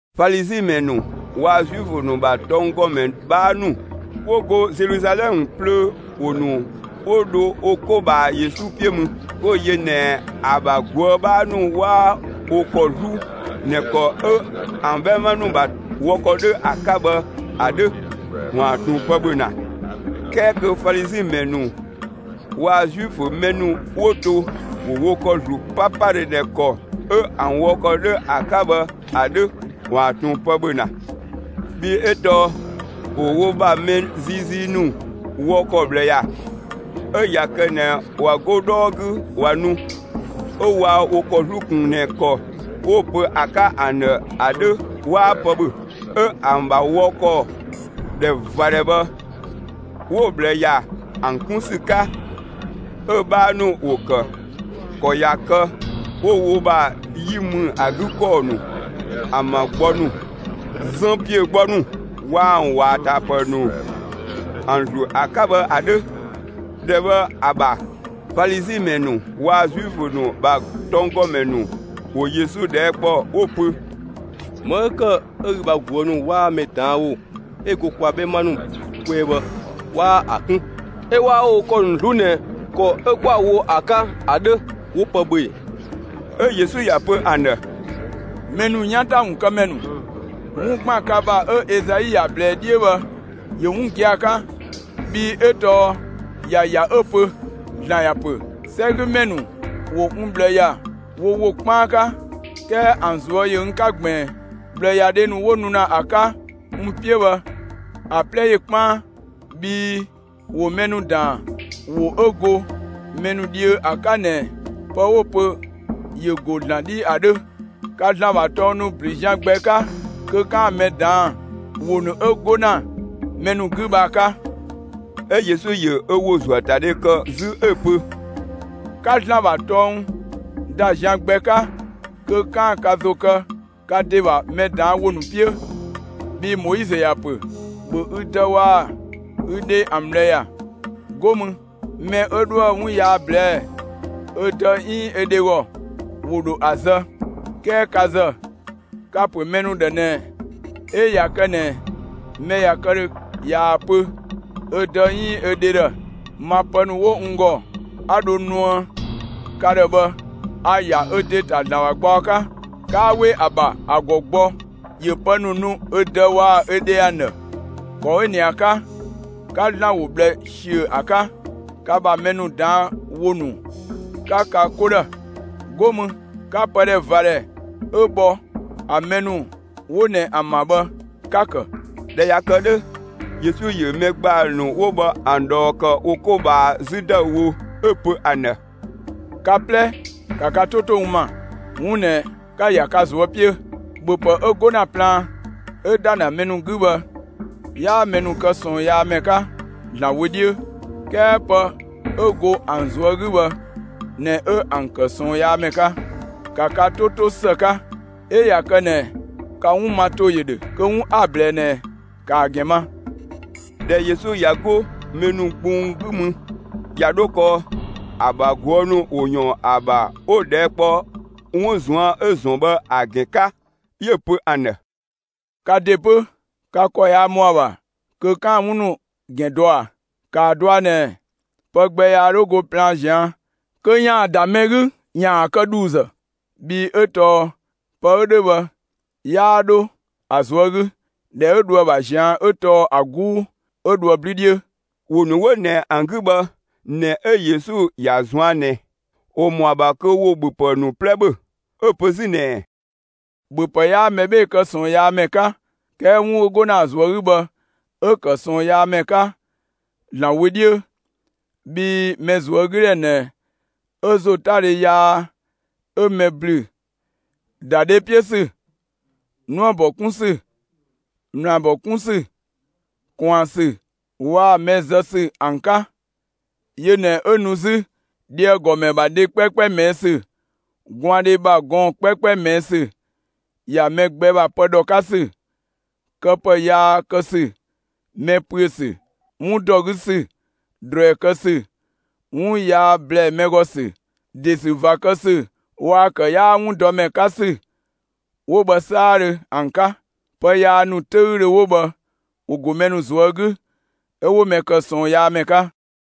Falizi ‑mɛ ‑nu waa‑ Zuifö ‑nu ‑bha tɔnggɔmɛ 'bhaa ‑nu 'wo go Zeluzalɛmë plöö, ‑wo ‑nu 'wo dho wo 'ko ꞊bhaa Yesu 'piö mü. 'Wo‑ yö ꞊nɛ ‑a ‑bha ꞊guë' 'bhaa ‑nu 'waa wo ‑kɔ 'zlu ꞊nɛ ‑kɔ 'ö ‑an 'bhɛma ‑nu ‑bha wɔ ‑kɔ 'dhö ‑a 'ka bhë ‑a 'dhö ‑waan ꞊tun pë ‑bhö ‑na, 'kɛɛ kö Falizi ‑mɛ ‑nu waa‑ Zuifö mɛ ‑nu 'wo to ‑wo wo ‑kɔ ‑zlu 'papadhö ꞊nɛ ‑kɔ 'ö ‑an wɔ ‑kɔ 'dhö ‑a 'ka bhë ‑a 'dhö ‑waan ꞊tun pë ‑bhö ‑na. Bhii 'ö tɔɔ ‑wo wo ‑bha mɛ ziizii ‑nu wɔ ‑kɔ ꞊bhlë ‑ya. 'Ö ꞊ya kë ꞊nɛ ꞊wa 'go 'dhɔɔ 'gü ꞊wa nu, 'ö waa wo ‑kɔ 'zlu ꞊kun ꞊nɛ ‑kɔ 'wo‑ pö ‑a 'ka ‑an ‑dhë ‑a 'dhö 'waa pë ‑bhö. 'Ö ‑an ‑bha wɔ ‑kɔ ‑dhɛ ꞊va ‑dhɛ bhë, 'wo‑ ꞊bhlë ‑ya ‑an 'kun ‑sü 'ka; 'ö‑ 'bhaa ‑nu ‑wo ‑kë ‑kɔ ꞊ya kë 'wo wo ‑bha 'yi ‑mü ‑a 'gü ‑kɔɔ ‑nu, ‑an ‑bha gbɔ ‑nu, zën ‑piö gbɔ ‑nu, waa‑ ‑an ‑wɔ ‑a ‑ta ‑pë ‑nu ‑an ‑zlu ‑a 'ka bhë ‑a 'dhö. ‑Dhɛ bhë ‑a ‑bha Falizi ‑mɛ ‑nu waa‑ Zuifö ‑nu ‑bha tɔnggɔmɛ ‑nu ‑wo Yesu ꞊dhɛɛ' ‑kpɔ 'wo‑ pö: «‑Më 'ö ‑kë 'ö ü bha ꞊guë' ‑nu 'waa mɛ ꞊daan' ‑wo 'ö go kwa 'bhɛma ‑nu kwɛɛ bhë 'waa ‑a 'kun, 'ö 'waa wo ‑kɔ ‑nu 'zlu ꞊nɛ ‑kɔ 'ö 'kwa‑ wo ‑a 'ka ‑a 'dhö, 'wo pë ‑bhö ‑e?» 'Ö Yesu ‑ya pö ‑an ‑dhë: «Mɛ ‑nu 'yan ‑ta ‑wun kë ‑mɛ ‑nu, 'wun ‑gban ka ‑bha 'ö Ezai ‑ya ꞊blɛɛ 'dhiö bhë ‑yö 'wun gia‑ 'ka, bhii 'ö tɔɔ ‑ya ‑ya 'ö‑ pö: ‑Zlan ‑ya pö: 'Sɛgümɛ ‑nu ‑wo n ꞊bhlë ‑ya wo ‑wo 'kpaan 'ka, 'kɛɛ ‑an ꞊zuö' ‑yö n 'ka ꞊gbiin. ꞊Bhlëyadhe ‑nu 'wo nu ‑na ‑a 'ka n 'piö bhë, ‑a 'plɛ ‑yö 'kpaan, bhii ‑wo mɛ ‑nu ‑daan ‑wo 'ö go mɛ ‑nu dhiö ‑a 'ka ꞊nɛ, pë 'wo‑ pö ‑yö ‑go ‑Zlan 'dhi ‑a 'dhö. Ka ‑Zlan ‑bha tɔng ‑nu ‑blü zian gbɛ 'ka kö 'kaan‑ mɛ ꞊daan' ‑wo ‑nu 'ö 'go ‑na mɛ ‑nu 'gü bhë ‑a 'ka.» 'Ö Yesu ‑yö ö ‑wo ‑zuöatadhe ‑kë 'zü 'ö‑ pö: «'Ka ‑Zlan ‑bha tɔng ‑da zian gbɛ 'ka kö 'kaan‑ ka ‑zo kë ka ‑de ‑bha mɛ ꞊daan' ‑wo ‑nu 'piö! Bhii Moizö ‑ya pö: ‑Bhö ü dë waa‑ ü dhe ‑an ꞊bhlë ‑ya! 'Go mü: Mɛ 'ö 'dhoë‑ 'wun yaa ꞊blɛɛ'‑ ö dë 'iin ö dhe ‑gɔ, ‑wo ‑dho ‑a zë. 'Kɛɛ ka ‑zë, ka ‑pö mɛ ‑nu ‑dhë ꞊nɛ 'ö ꞊ya kë ꞊nɛ mɛ ꞊ya kë ‑dhö ꞊yaa‑ pö ö dë 'iin ö dhe ‑dhë: ‹Ma pë ‑nu 'wo n ‑gɔ, 'a dho nuë ka ‑dhë bhë, a‑ ‑ya ö ‑de ‑ta ‑Zlan ‑bha gbaɔ 'ka›, 'kaa 'we ‑a ‑bha ‑a ‑gɔ gbɔ ‑yö pë ‑nu nu ö dë waa‑ ö dhe ‑an ‑dhë. ‑Kɔ 'ö ꞊nɛ ‑a 'ka, 'ka ‑Zlan ‑wo ꞊bhlë ꞊siö ‑a 'ka, ka ‑bha mɛ ‑nu ꞊daan' ‑wo ‑nu 'ka ka 'ko ‑dhë. 'Go mü, 'ka pë ‑dhɛ ꞊va ‑dhɛ 'ö bhɔ ‑a mɛ ‑nu 'wo ꞊nɛ ‑an ‑bha bhë, 'ka‑ ‑kë.» ꞊Dhɛ ꞊ya kë 'dhö, Yesu ‑yö mɛ ‑gbaa ‑nu 'wo bhë ‑an ꞊dhɔɔ ‑kë wo 'ko ꞊bhaa 'zü ‑dëüwo, 'ö‑ pö ‑an ‑dhë: «Ka 'plɛ, ‑ka ka 'to 'to n ‑ma, 'wun ꞊nɛ 'ka‑ ‑ya ka ꞊zuö' 'piö: ‑Bhöpë 'ö 'go ‑na plaan 'ö ‑da ‑na mɛ ‑nu 'gü bhë 'yaa mɛ ‑nu kë ꞊sɔɔnyaamɛ 'ka ‑Zlan wö 'dhiö, 'kɛɛ pë 'ö go ‑an ꞊zuö' 'gü bhë ꞊nɛ 'ö ‑an ‑kë ꞊sɔɔnyaamɛ 'ka. ‑Ka ka 'to 'to ‑së 'ka! 'Ö ꞊ya kë ꞊nɛ ka 'wun ma ‑to ‑yö ‑dhö kö 'wun 'a‑ ꞊blɛɛ ꞊nɛ, ‑kaa ‑gɛn ma!» ꞊Dhɛ Yesu ꞊ya 'go mɛ ‑nu gbung 'gü mü, ꞊ya 'dho kɔɔ, ‑a ‑bha ꞊guë' ‑nu ‑wo ‑yɔɔn ‑a ‑bha 'wo‑ ꞊dhɛɛ' kpɔ 'wun ꞊zuan' 'ö‑ ‑zɔn bhë ‑a ‑gɛn 'ka. 'Yö‑ pö ‑an ‑dhë: «Ka ‑de 'pö, ka ‑kɔ yaa ‑mɔ ‑a ‑bha kö 'kaan‑ 'wun ‑gɛn dɔ ꞊a? ‑Kaa dɔa ꞊nɛ, pë gbɛ yaa 'dho go plaan ꞊zian' kö ‑yaan ‑da mɛ 'gü ‑yaan ‑a kë ‑dhuuzë. Bhii 'ö tɔɔ pë 'ö 'dhö bhë 'yaa 'dho ‑a ꞊zuö' 'gü, ‑dhɛ 'ö dho ‑a ‑bha ꞊zian' 'ö tɔɔ ‑a 'guu, 'ö dhoë 'blü 'dhiö.» (‑Wo ‑nu 'wo ꞊nɛ ‑an 'gü bhë ꞊nɛ 'ö Yesu ‑ya ꞊zuan' ꞊nɛ, ‑wo ‑mɔ ‑a ‑bha kö ‑wo ‑bhöpë ‑nu 'plɛ ‑bhö.) 'Ö‑ pö 'zü ꞊nɛɛ: «‑Bhöpë 'yaa mɛ 'bhee‑ kë ꞊sɔɔnyaamɛ 'ka 'kɛɛ 'wun 'ö 'go ‑na ‑a ꞊zuö' 'gü bhë 'ö‑ ‑kë ꞊sɔɔnyaamɛ 'ka ‑Zlan wö 'dhiö. Bhii mɛ ꞊zuögüdhɛ ꞊nɛ 'ö ‑zotadhe yaa 'ö mɛ ‑blü ‑da dhe 'piö ‑sü, 'nuëbɔ 'kun ‑sü, ꞊mlaabɔ 'kun ‑sü, ꞊kwaan ‑sü waa‑ mɛ zë ‑sü ‑an 'ka. Yö ꞊nɛ 'ö nu 'zü, dheagɔmɛ ‑bha dhe 'kpɛɛkpɛ ꞊mɛɛ' ‑sü, gwaandhe ‑bha gɔɔn‑ 'kpɛɛkpɛ ꞊mɛɛ' ‑sü, ‑ya mɛ gbɛ ‑bha pë ‑dhɔ 'ka ‑sü, këpë yaa kë ‑sü, mɛ ‑püö ‑sü, 'wun ‑dɔ 'gü ‑sü, ꞊druɛi kë ‑sü, 'wun yaa ‑blɛɛ mɛ ‑gɔ ‑sü, ‑de ‑sü ꞊va kë ‑sü waa‑ ‑kë 'yaa 'wun dɔ ‑mɛ 'ka ‑sü 'wo bhë 'saadhö ‑an 'ka. Pë yaa ‑nu 'töüdhö 'wo bhë ‑wo ‑go mɛ ‑nu ꞊zuö' 'gü, 'ö 'wo mɛ ‑kë ꞊sɔɔnyaamɛ 'ka.»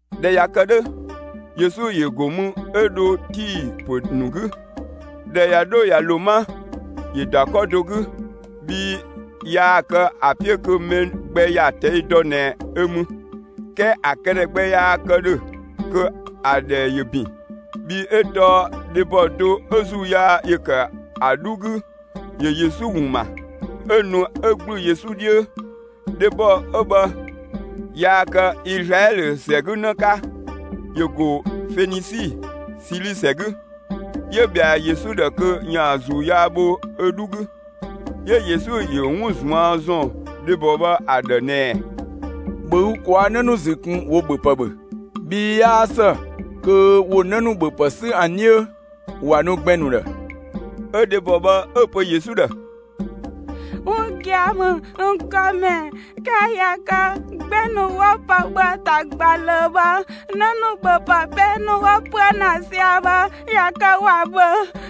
꞊Dhɛ ꞊ya kë 'dhö, Yesu ‑yö ‑go mü 'ö dho Tii ‑pö ‑nu 'gü. ꞊Dhɛ ꞊ya 'dho ꞊ya ‑lo 'ma, ‑yö ‑da 'kɔ do 'gü, bhii yaa kë ‑a 'piö kö mɛ gbɛ ‑ya ꞊tɛi' dɔ ꞊nɛ ö mü. 'Kɛɛ ‑a këdhɛ gbɛ yaa kë ‑dhö kö ‑a ‑dhɛ ‑yö ‑bin. Bhii 'ö tɔɔ dhebɔ do 'ö ‑zuu yaa ‑yö ‑kë ‑a 'dhu 'gü, ‑yö Yesu ‑wun ‑ma. 'Ö nu 'ö ‑gblü Yesu 'dhiö. Dhebɔ 'ö bhë yaa kë Izlaɛlö ‑sɛ 'gü 'në 'ka, ‑yö ‑go Fenisi, Sili ‑sɛ 'gü; 'yö ꞊bhɛa Yesu ‑dhë kö ‑yaan ‑zuu yaa bho ö 'dhu 'gü. 'Yö Yesu ‑yö 'wun ꞊zuan' ‑zɔn dhebɔ bhë ‑a ‑dhë ꞊nɛɛ: «‑Bhö ü ꞊kwaa' 'në ‑nu ‑zü ꞊kun, ‑wo ‑bhöpë ‑bhö, bhii 'yaa ‑së kö ‑wo 'në ‑nu ‑bhöpë 'sü ‑an 'dhiö ‑wa nu gbɛn‑ ‑nu ‑dhë.» 'Ö dhebɔ bhë 'ö‑ pö Yesu ‑dhë: «'Wun gia‑ ‑mü, n ‑Gɔmɛ, 'kɛɛ ꞊ya kë gbɛn‑ ‑nu 'wo pë ‑bhö ‑a ‑ta ꞊gba ꞊löö bhë, 'në ‑nu ‑bhöpë 'pee ‑nu 'wo ‑püö ‑na sia‑ bhë ꞊ya kë ‑wa ‑bhö.»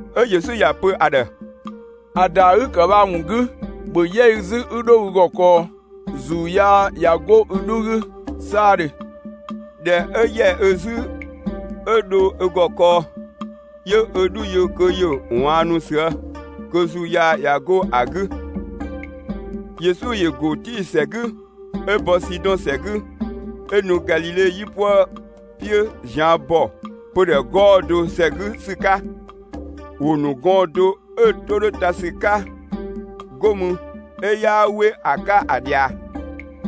'Ö Yesu ‑ya pö ‑a ‑dhë: «‑A ‑daa 'ü‑ ‑kë bhë ‑a ‑wun 'gü, ‑bhö 'yɛ ü 'zü 'ü 'dho ü ‑gɔ kɔɔ, ‑zuu yaa ꞊ya 'go ü 'dhu 'gü 'saadhö.» ꞊Dhɛ 'ö ‑yɛ ö 'zü 'ö dho ö ‑gɔ kɔɔ, 'yö ö 'dhu yö kö ‑yö ꞊waannu ꞊süë', kö ‑zuu yaa ꞊ya 'go ‑a 'gü. Yesu ‑yö ‑go Tii ‑sɛ 'gü, 'ö bɔ Sidɔn ‑sɛ 'gü, 'ö nu Galile 'yipuë 'piö ꞊zian' ‑bɔ pödhɛ 'gɔɔ‑ do ‑sɛ 'gü ‑sü 'ka. ‑Wo ‑nu gɔɔn‑ do 'ö‑ 'to 'dhö ta ‑sü 'ka, 'go mü 'ö 'yaa 'we ‑a 'ka ‑a ꞊dhia.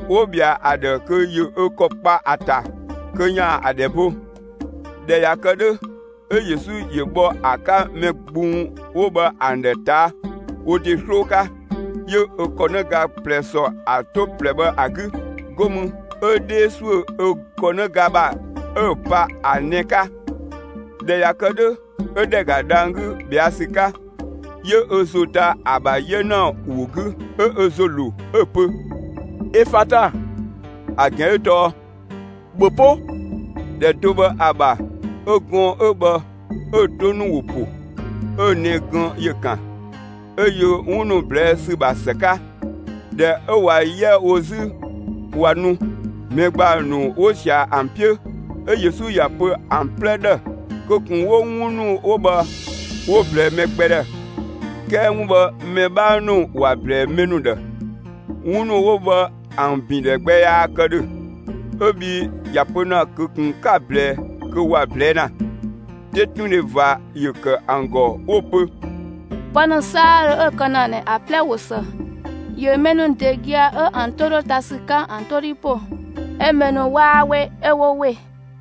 'Wo ꞊bhɛa ‑a ‑dhë kö ‑yö ö ‑kɔ kpa ‑a ‑ta kö ‑yaan ‑a ‑dhɛ bo. ꞊Dhɛ ꞊ya kë 'dhö, 'ö Yesu ‑yö bhɔ ‑a 'ka mɛ gbung 'wo bhë ‑an ‑dhë ꞊taa' wo ‑de 'sloo 'ka, 'yö ö ‑kɔnëga ꞊plɛ ‑sɔ ‑a 'to ꞊plɛ bhë ‑a 'gü, 'go mü 'ö 'dhee ‑suö ö ‑kɔnëga ‑bha 'ö‑ pa ‑a nɛ‑ 'ka. ꞊Dhɛ ꞊ya kë 'dhö, 'ö ‑dhɛ ‑ga dhang‑ 'gü ꞊bhɛa' ‑sü 'ka. 'Yö ö ‑zo ta ‑a ‑bha 'yena ‑wo 'gü 'ö ö ‑zo ‑lo, 'ö‑ pö: «Efata!» (‑A ‑gɛn 'ö tɔɔ: «‑Bhö 'po!») ‑Dhɛ do bhë ‑a ‑bha 'ö gɔɔn‑ 'ö bhë 'ö‑ 'to ‑nu ‑wo ‑po, 'ö‑ nɛ‑ gën ‑yö ‑kan, 'ö yö 'wun ‑nu ꞊blɛɛ' ‑sü ‑bha ‑së 'ka. ꞊Dhɛ 'ö ꞊wa 'yɛ wo 'zü ꞊wa nu, mɛ ‑gbaa ‑nu 'wo sia‑ ‑an 'piö 'ö Yesu ‑ya pö ‑an 'plɛ ‑dhë kö ꞊kun 'wo 'wun ‑nu 'wo bhë 'wo‑ ꞊blɛɛ mɛ gbɛ ‑dhë. 'Kɛɛ 'wun bhë mɛ 'bha ‑nu ‑wa ꞊blɛɛ mɛ ‑nu ‑dhë. ('Wun ‑nu 'wo bhë ‑an ‑bindhɛ gbɛ yaa kë ‑dhö) 'ö bhii ‑ya pö ‑na kö ꞊kun 'ka‑ ꞊blɛɛ' kö ‑wa ꞊blɛɛ' ‑na. 'Tetundhe ꞊va ‑yö ‑kë ‑an ‑gɔ 'wo‑ pö: «Pë ‑nu 'saadhö 'ö‑ kë ‑na ꞊nɛ ‑a 'plɛ ꞊wo ‑së! ‑Yö mɛ ‑nu ‑de gia‑ 'ö ‑an 'to 'dhö ta ‑sü 'ka ‑an 'to 'dhi ‑po, 'ö mɛ ‑nu 'waa 'we 'ö 'wo ‑we!»